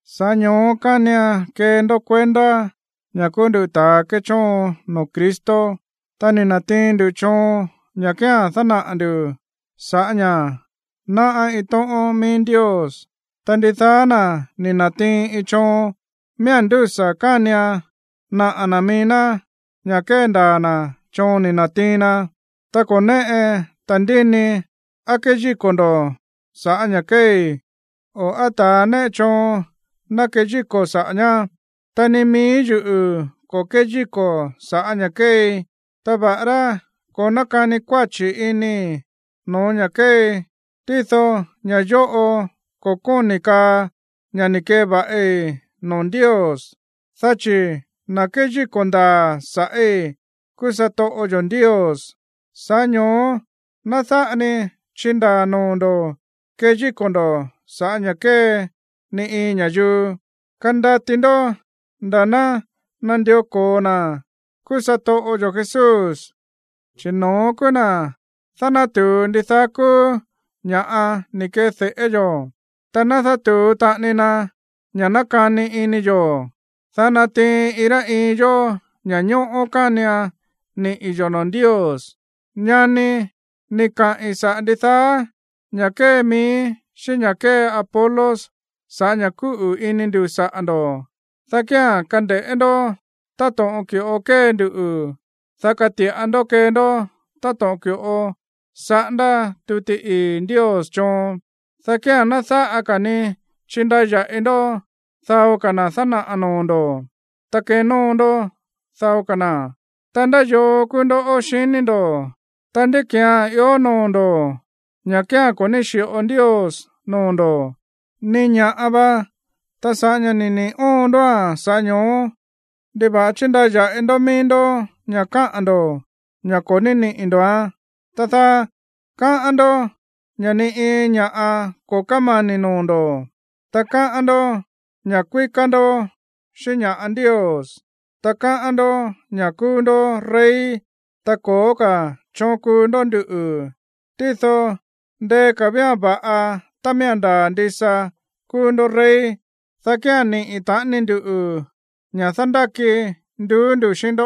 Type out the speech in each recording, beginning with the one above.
Sa̱ꞌá ño̱ó kánian kee ndó kuendá ña̱ kúú nduꞌu̱ ta̱a kéchóon noo̱ Cristo, ta ni̱ na̱tiin ndu choon ña̱ kía̱n dánaꞌa̱ ndu̱ sa̱ꞌá ña̱ náꞌá iin tóꞌón mií Ndios. Ta ndidaá na̱ ni̱ na̱tiin iin choon, miía̱n ndúsa̱ kánian naꞌa̱ na̱ mií ná ña̱ kéndaa̱ na̱ choon ni̱ na̱tiin na. Ta ko̱ néꞌe ta̱ndínii á keyíko̱ ndo̱ sa̱ꞌá ña̱ kéei, o á ta̱a néꞌe choon ná keyíko̱ saꞌa̱ ñá. Ta ni mií yuꞌu̱ ko̱ kéyíko̱ sa̱ꞌá ña̱ kéei. Ta va̱ꞌará ko̱ nákani kuáchi̱ inii̱ no̱ó ña̱ kéei, tído ña̱ yóꞌo ko̱ kóni̱ kaa ña̱ ni̱ keva̱ꞌi noo̱ Ndios. Dá chi̱ na̱ kéyíko̱ ndaa̱ sa̱ꞌí kúú satoꞌo yo̱ Ndios. Sa̱ꞌá ño̱ó ná dáꞌa ni chindaa̱ noo̱ ndo̱ keyíko̱ ndo̱ sa̱ꞌá ña̱ kée ni iin ña̱yuu. Kandati ndó nda̱ ná nandió ko̱o na̱ kúú satoꞌo yo̱ Jesús, chi̱ no̱ón kúú na̱ dánátu̱u ndidaá kúú ña̱ꞌa ni̱ ke̱de̱ꞌé yo̱. Ta dánátu̱u taꞌani na ña̱ nákani ini yo̱, dá natiin iin rá iin yó ña̱ñóꞌó kánian niꞌi̱ yo̱ noo̱ Ndios. Ñani, ni̱ kaꞌi̱n saꞌa̱ ndidaá ña̱ kée miíí xíꞌín ña̱ kée Apolos sa̱ꞌá ña̱ kúꞌu̱ ini ndu̱ saꞌa̱ ndo̱, dá kía̱n kande̱ꞌé ndó táto̱ꞌon ki̱ꞌo kée ndu, dá kati̱ꞌa ndó kee ndó táto̱ꞌon ki̱ꞌo saꞌándá tuti ii̱ Ndios choon, dá kía̱n ná dáꞌa ka̱ ni chindaya̱ꞌi ndó dao na̱ dánaꞌa̱ noo̱ ndo̱, ta kenóo ndó dao ka̱ na̱. Ta, ¿ndá yoo kúú ndó, xiní ndo̱? Ta, ¿ndí ki̱án ió noo̱ ndo̱, ña̱ kía̱n ko̱ ní xi̱ꞌo Ndios noo̱ ndo̱? Ni ña̱ꞌa va. Ta sa̱ꞌá ña̱ ni̱ niꞌi̱ óon ndóa̱n, sa̱ꞌá ño̱ó, ¿ndiva̱ꞌa chíndaya̱ꞌi ndó mií ndó ña̱ káꞌa̱n ndo̱ ña̱ ko̱ ní niꞌi̱ ndo̱án, tá dáá? Káꞌán ndó ña̱ ni iin ña̱ꞌa ko̱ kámani̱ noo̱ ndo̱, ta káꞌán ndó ña̱ kuíká ndó xíꞌín ña̱ꞌa Ndios, ta káꞌán ndó ña̱ kúú ndó rey, ta ko̱ó ka̱ choon kúú ndó nduꞌu̱. Tído ndeé ka̱ vía̱n va̱ꞌa tá miía̱n ndaa̱ ndisa kúú ndó rey, dá kía̱n niꞌi̱ taꞌani ndu ña̱ dándáki nduú nduꞌu̱ xíꞌín ndó.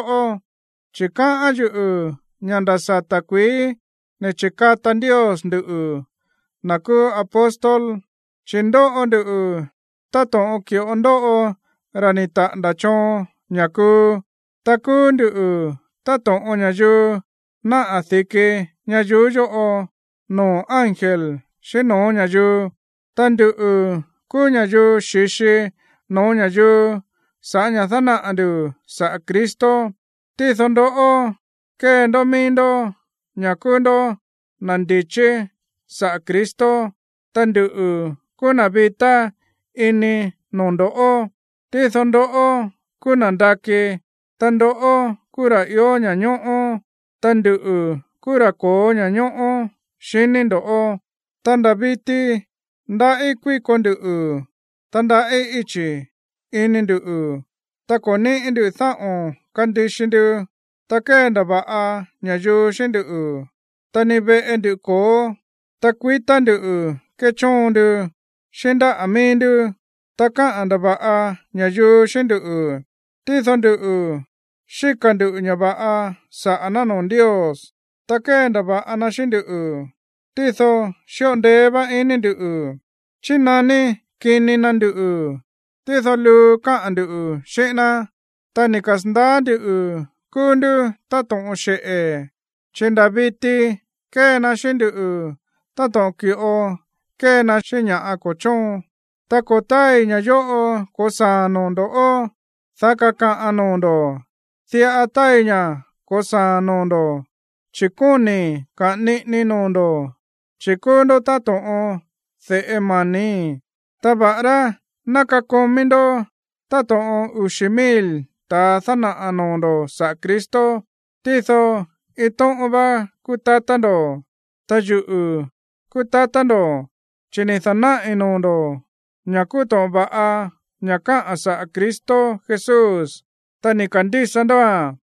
Chi̱ káꞌán yuꞌu̱ ña̱ nda̱ sata̱ kuií ni̱ chi̱kata Ndios nduꞌu̱, na̱ kúú apóstol. Chi̱ ndóꞌo nduꞌu̱ táto̱ꞌon ki̱ꞌo ndóꞌo ra̱ ni̱ taꞌa̱nda̱ choon ña̱ kuu. Ta kúú nduꞌu̱ táto̱ꞌon ña̱yuu náꞌa̱ di̱ki ñayuú yóꞌo, noo̱ ángel xíꞌín no̱ó ña̱yuu. Ta nduꞌu̱ kúú ña̱yuu xi̱xi no̱ó ña̱yuu sa̱ꞌá ña̱ dánaꞌa̱ ndu̱ saꞌa̱ Cristo. Tído ndoꞌó, kée ndó mií ndó ña̱ kúú ndó na̱ ndi̱chí saꞌa̱ Cristo. Ta nduꞌu̱ kúú na̱ vitá ini noo̱ ndo̱ꞌó, tído ndoꞌó kúú na̱ nda̱kí. Ta ndoꞌó kúú na̱ ió ña̱ñóꞌó, ta nduꞌu̱ kúú ra̱ ko̱ó ña̱ñóꞌó, xiní ndo̱. Ta nda̱ viti ndaꞌí kuíko nduꞌu̱, ta ndaꞌí íchi̱ ini ndu̱, ta ko̱ níꞌi̱ ndú dáꞌo̱n kandixi ndu. Ta kéndava̱ꞌa ña̱yuu xíꞌín ndú, ta ni veꞌe ndu ko̱ó. Ta kuitá ndu̱ kéchóon ndu xíꞌín ndáꞌa̱ mií ndú. Ta káꞌa̱n ndava̱ꞌa ña̱yuu xíꞌín ndú, tído nduꞌu̱, xíka̱ ndu̱ ña̱ va̱ꞌa saꞌa̱ ná noo̱ Ndios. Ta kéndava̱ꞌa na xíꞌín nduꞌu̱, tído xíꞌo ndeé vá ini ndu̱. Chínaní kini na nduꞌu̱, tído luu káꞌa̱n ndu̱ xíꞌín ná. Ta ni̱ kasa̱ndaá ndu̱ kúú ndú táto̱ꞌon xeꞌe̱, chi̱ nda̱ viti kée na xíꞌín nduꞌu̱ táto̱ꞌon ki̱ꞌo kée na xíꞌín ña̱ ko̱ chóon. Ta ko̱ táai ña̱ yóꞌo ko̱saa̱ noo̱ ndo̱, dá kakaꞌan noo̱ ndo̱. Diꞌa táai ña̱ ko̱saa̱ noo̱ ndo̱, chi̱ kóni̱i̱ kaꞌa̱n niꞌinii noo̱ ndo̱, chi̱ kúú ndó táto̱ꞌon de̱ꞌe mani̱í. Ta va̱ꞌará ná kakomí ndó táto̱ꞌon uxi̱ mil ta̱ dánaꞌa̱ noo̱ ndo̱ saꞌa̱ Cristo, tído iin tóꞌón vá kúú tatá ndo̱. Ta yuꞌu̱ kúú tatá ndo̱, chi̱ ni̱ da̱náꞌi̱ noo̱ ndo̱ ña̱ kúú to̱ꞌon va̱ꞌa ña̱ káꞌa̱n saꞌa̱ Cristo Jesús, ta ni̱ ka̱ndísa ndóa̱n.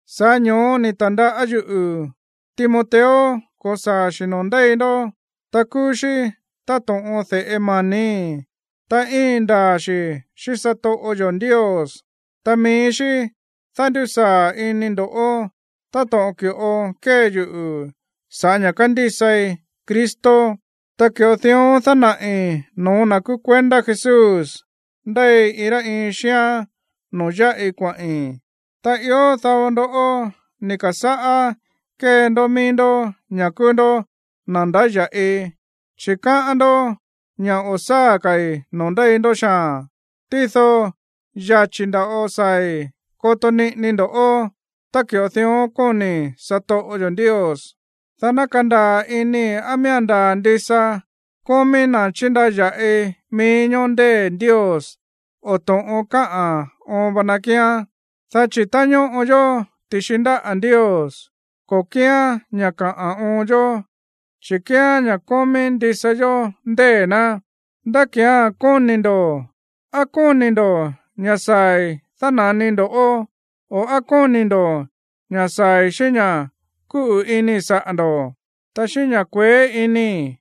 Sa̱ꞌá ño̱ó ni̱ ta̱ndaꞌá yuꞌu̱ Timoteo ko̱saa̱ xi̱ noo̱ ndéi ndó. Ta kúú xí táto̱ꞌon de̱ꞌe mani̱í, ta íin ndaa̱ xi̱ xíꞌín satoꞌo yo̱ Ndios. Ta mií xí dándusaa̱ ini ndo̱ táto̱ꞌon ki̱ꞌo kée yuꞌu̱ sa̱ꞌá ña̱ kándísai Cristo, ta ki̱ꞌo dión dánaꞌi̱ no̱ó na̱ kúú kuendá Jesús ndéi iin rá iin xíán noo̱ yáꞌi kuaꞌi̱n. Ta ió dao ndó ni̱ ka̱sáꞌá kée ndó mií ndó ña̱ kúú ndó na̱ ndáya̱ꞌi, chi̱ káꞌán ndó ña̱ o̱ sáa̱ ka̱i̱ noo̱ ndéi ndó xaa̱n. Tído yachi̱ nda̱ꞌo saa̱i̱ koto niꞌini ndoꞌó tá ki̱ꞌo dión kóni̱ satoꞌo yo̱ Ndios, dá ná kandaa̱ inii̱ á miía̱n ndaa̱ ndisa kómí na̱ chíndaya̱ꞌi mií ñóó ndée̱ Ndios, o to̱ꞌon káꞌa̱n oon va na kíán. Dá chi̱ tá ñóꞌo yó ti̱xi ndáꞌa̱ Ndios, ko̱ kíán ña̱ kaꞌa̱n oon yó, chi̱ kíán ña̱ kómí ndisa yó ndée̱ ná. ¿Ndá ki̱án kóni̱ ndo̱? ¿Á kóni̱ ndo̱ ña̱ saa̱i̱ dána̱nii ndo̱ꞌó, o á kóni̱ ndo̱ ña̱ saa̱i̱ xíꞌín ña̱ kúꞌu̱ inii̱ saꞌa̱ ndo̱, ta xíꞌín ña̱ kueé inii̱?